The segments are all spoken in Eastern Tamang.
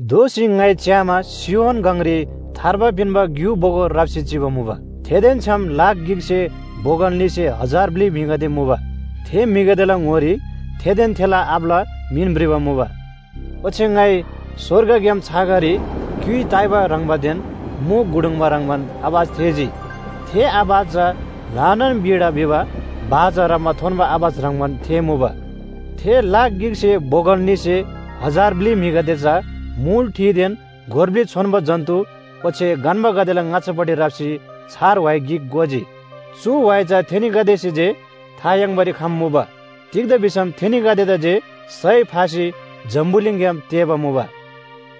दोःसी ङाइ च्‍यामा सियोन गङरी थार्बा पिन्‍बा ग्‍यु बोगो राप्‍सी चिबा मुबा। थेदेन छ्‌याम लाख गिकसे बोगल न्‍हीसे हजार ब्‍लि म्‍हिगदे मुबा। थे म्‍हिगदेला ङोरी थेदेन थेला आबाला मिन भ्रिबा मुबा। ओच्‍छे ङाइ स्‍वर्गग्‍याम छाँगारी क्‍युइ ताइबा ह्रङ्‌बादेन मु गुडुङ्बा ह्रङ्‌बान आवाज थेःजी। थे आवाज चा ल्‍हानान वीणा भिबा बाजा ह्राप्‍मा थोन्‍बा आवाज ह्रङ्‌बान थेःमुबा। थे लाख गिकसे बोगल न्‍हीसे हजार ब्‍लि म्‍हिगदे चा मुल ठिदेन गोर ब्‍लि छोन्‍बो जन्‍तु ओच्‍छे गन्‍बागदेला ङाच्‍छापट्टि राप्‍सी छार व्‍हाइ गिक गोजी। चु व्‍हाइ चा थेनीगदेसे जे था याङ्बारी खम्‍मुबा। तिग्‍दा भिसम थेनीगदेदा जे सय फासी जम्‍बुलिङग्‍याम तेःबा मुबा।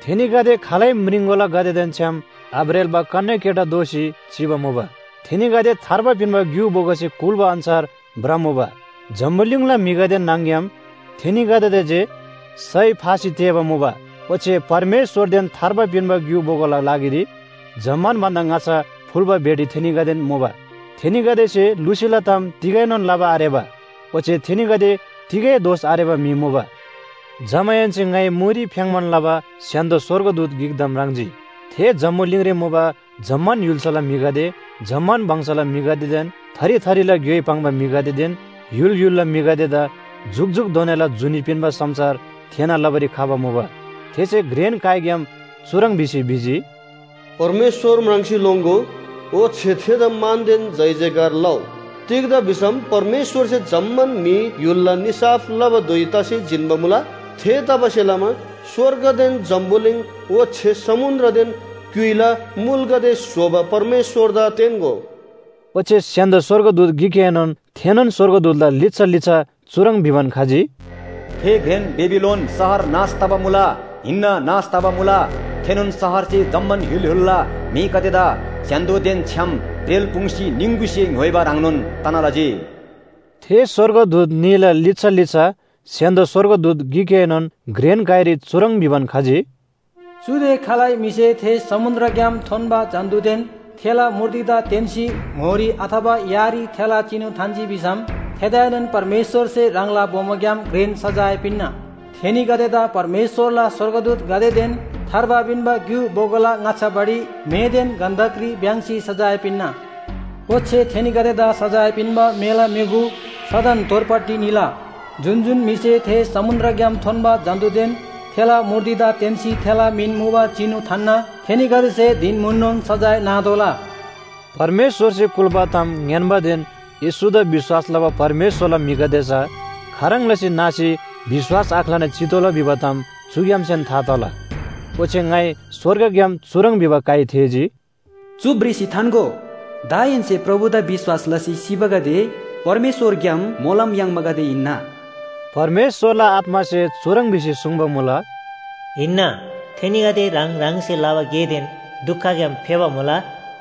थेनीगदे खालै म्रिङकोलागदेदेन छ्‌याम आब्रेल्‍बा कन्‍याकेटा दोसी चिबा मुबा। थेनीगदे थार्बा पिन्‍बा ग्‍यु बोगोसे कुल्‍बा अन्‍छार भ्रमुबा। जम्‍बुलिङला म्‍हिगदे न्‍हङ‍ग्‍याम थेनीगदेदा जे सय फासी तेःबा मुबा ओच्‍छे परमेश्‍वरदेन थार्बा पिन्‍बा ग्‍यु बोगोला लागिरी जम्‍मान भन्‍दा ङाच्‍छा फुल्‍बा भेटी थेनीगदेन मुबा। थेनीगदेसे लुसीला ताम तिगैनोन लबा आरेबा, ओच्‍छे थेनीगदे तिगै दोष आरेबा म्‍हि मुबा। जमाहेन्‍से ङाइ मुरी फ्‍याङ्‌बान लबा स्‍य्‍हान्‍दो स्‍वर्गदूत गिकदा म्राङ्जी। थे जम्‍बुलिङरी मुबा जम्‍मान य्‍हुल्‍साला म्‍हिगदे, जम्‍मान वंशला म्‍हिगदेदेन थरी थरीला ग्‍योइ पाङ्बा म्‍हिगदेदेन य्‍हुल य्‍हुलला म्‍हिगदेदा जुकजुकधोनाला जुनी पिन्‍बा समाचार थेःना लबारी खबा मुबा। थेसे घ्रेन काइग्‍याम चुह्रङ् भिसी भिजी, “परमेश्‍वर म्राङ्सी लोङ्‍गो, ओच्‍छे थेदा मानदेन जयजयकार लउ। तिग्‍दा भिसम परमेश्‍वरसे जम्‍मान म्‍हि य्‍हुलला निसाफ लबा धुइ तसी जिन्‍बा मुला। थेतबासेलमा स्‍वर्गदेन जम्‍बुलिङ ओच्‍छे समुन्‍द्रदेन क्‍युइला मुलगदे स्‍होबा परमेश्‍वरदा तेन्‍गो।” ओच्‍छे स्‍य्‍हान्‍दो स्‍वर्गदूत गिकएनोन थेनोन स्‍वर्गदूतला लिच्‍छा लिच्‍छा चुह्रङ् भिबान खजी, “थे घ्रेन बेबिलोन शहर नाश तबा मुला! हिन्‍ना नाश तबा मुला। थेनोन शहरसे जम्‍मान य्‍हुल य्‍हुलला म्‍हिगदेदा स्‍य्‍हान्‍दोदेन छ्‌याम ब्रेल्‍पुङ्‌सी निङगुसे ङ्‌य्‍होइबा ह्रङ्नोन तना लजी।” थे स्‍वर्गदूत न्‍हीला लिच्‍छा लिच्‍छा स्‍य्‍हान्‍दो स्‍वर्गदूत गिकएनोन घ्रेन काइरी चुह्रङ् भिबान खजी, “चुदे खालै म्‍हिसे थे समुन्‍द्रग्‍याम थोन्‍बा जन्‍तुदेन थेला मूर्तिदा तेन्‍सी ङोरी अथवा यारी थेला चिनु थान्‍जी भिसम, थेदाएनोन परमेश्‍वरसे ह्राङला बोमोग्‍याम घ्रेन सजाय पिन्‍ना, थेनीगदेदा परमेश्‍वरला स्‍वर्गदूतगदेदेन थार्बा पिन्‍बा ग्‍यु बोगोला ङाच्‍छापट्टि मेदेन गन्‍धकरी भ्‍याङ्‍सी सजाय पिन्‍ना। ओच्‍छे थेनीगदेदा सजाय पिन्‍बा मेला म्‍युगु सदन तोरपट्टि निला। जुन जुन म्‍हिसे थे समुन्‍द्रग्‍याम थोन्‍बा जन्‍तुदेन थेला मूर्तिदा तेन्‍सी थेला मिन मुबा चिनु थान्‍ना थेनीगदेसे धिन म्‍हुननोन सजाय नातोःला।” परमेश्‍वरसे कुल्‍बा ताम ङ्‌यान्‍बादेन येशूदा विश्‍वास लबा परमेश्‍वरला म्‍हिगदे चा खाह्रङ् लसी नासी विश्‍वास आख्‍लाना चितोःला भिबा ताम चुग्‍यामसेन था तला। ओच्‍छे ङाइ स्‍वर्गग्‍याम चुह्रङ् भिबा काइ थेःजी, “चु भ्रिसी थान्‍गो, दाहेन्‍से प्रभुदा विश्‍वास लसी सिबागदे परमेश्‍वरग्‍याम मोलम याङ्बागदे हिन्‍ना।” परमेश्‍वरला आत्‍मासे चुह्रङ् भिसी सुङ्बा मुला, “हिन्‍ना, थेनीगदे ह्राङ ह्राङसे लबा गेदेन दुखग्‍याम फेबा मुला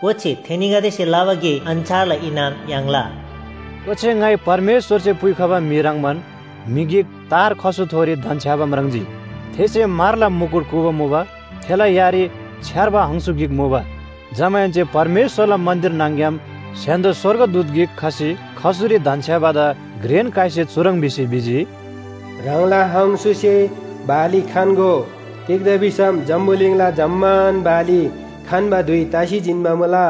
ओच्‍छे थेनीगदेसे लबा गे अन्‍छारला इनाम याङ्ला। ओच्‍छे ङाइ परमेश्‍वरसे पुइखबा म्‍हि ह्रङ्‌बान म्‍हि गिक तार खसुथोरी धन्‍छ्‌याबा म्राङ्जी। थेसे म्‍हरला मुकुट कूबा मुबा। थेला यारी छ्‌यार्बा हङसु गिक मुबा। जमाहेन्‍से परमेश्‍वरला मन्‍दिर न्‍हङ‍ग्‍याम स्‍य्‍हान्‍दो स्‍वर्गदूत गिक खसी खसुरी धन्‍छ्‌याबादा घ्रेन काइसे चुह्रङ् भिसी भिजी, “ह्राङला हङसुसे बाली खन्‍गो। तिग्‍दा भिसम जम्‍बुलिङला जम्‍मान बाली खन्‍बा धुइ तसी जिन्‍बा मुला।”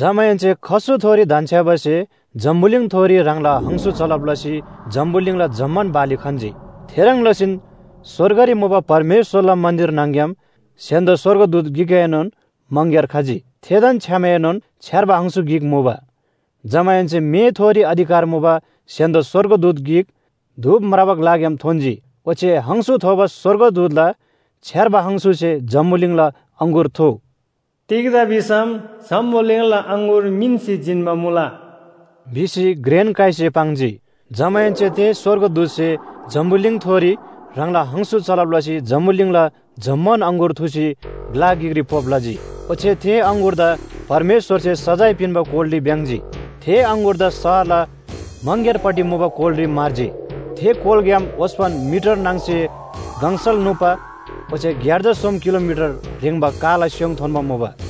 जमाहेन्‍से खसुथोरी धन्‍छ्‌याबासे जम्‍बुलिङथोरी ह्राङला हङसु चलब लसी जम्‍बुलिङला जम्‍मान बाली खन्‍जी। थेह्रङ् लसीन स्‍वर्गरी मुबा परमेश्‍वरला मन्‍दिर न्‍हङ‍ग्‍याम स्‍य्‍हान्‍दो स्‍वर्गदूत गिकएनोन मङग्‍यार खजी। थेदेन छ्‌यामएनोन छ्‌यार्बा हङसु गिक मुबा। जमाहेन्‍से मेथोरी अधिकार मुबा स्‍य्‍हान्‍दो स्‍वर्गदूत गिक धूप म्राबा ग्‍लाग्‍याम थोन्‍जी। ओच्‍छे हङसु थोबा स्‍वर्गदूतला छ्‌यार्बा हङसुसे जम्‍बुलिङला अङगुर थुउ, तिग्‍दा भिसम जम्‍बुलिङला अङगुर मिन्‍सी जिन्‍बा मुला” भिसी घ्रेन काइसे पाङ्जी। जमाहेन्‍से थे स्‍वर्गदूतसे जम्‍बुलिङथोरी ह्राङला हङसु चलब लसी जम्‍बुलिङला जम्‍मान अङगुर थुसी ग्‍ला गिकरी पोप लजी। ओच्‍छे थे अङगुरदा परमेश्‍वरसे सजाय पिन्‍बा कोलरी भ्‍याङ्‍जी। थे अङगुरदा शहरला मङग्‍यारपट्टि मुबा कोलरी म्‍हर्जी। थे कोलग्‍याम ओस्‍पन मिटर नाङ्‌से गङसल नुप्‍बा ओच्‍छे ग्‍यार्जा सोम किलोमिटर ह्रेङ्बा काला स्‍योङ थोन्‍बा मुबा।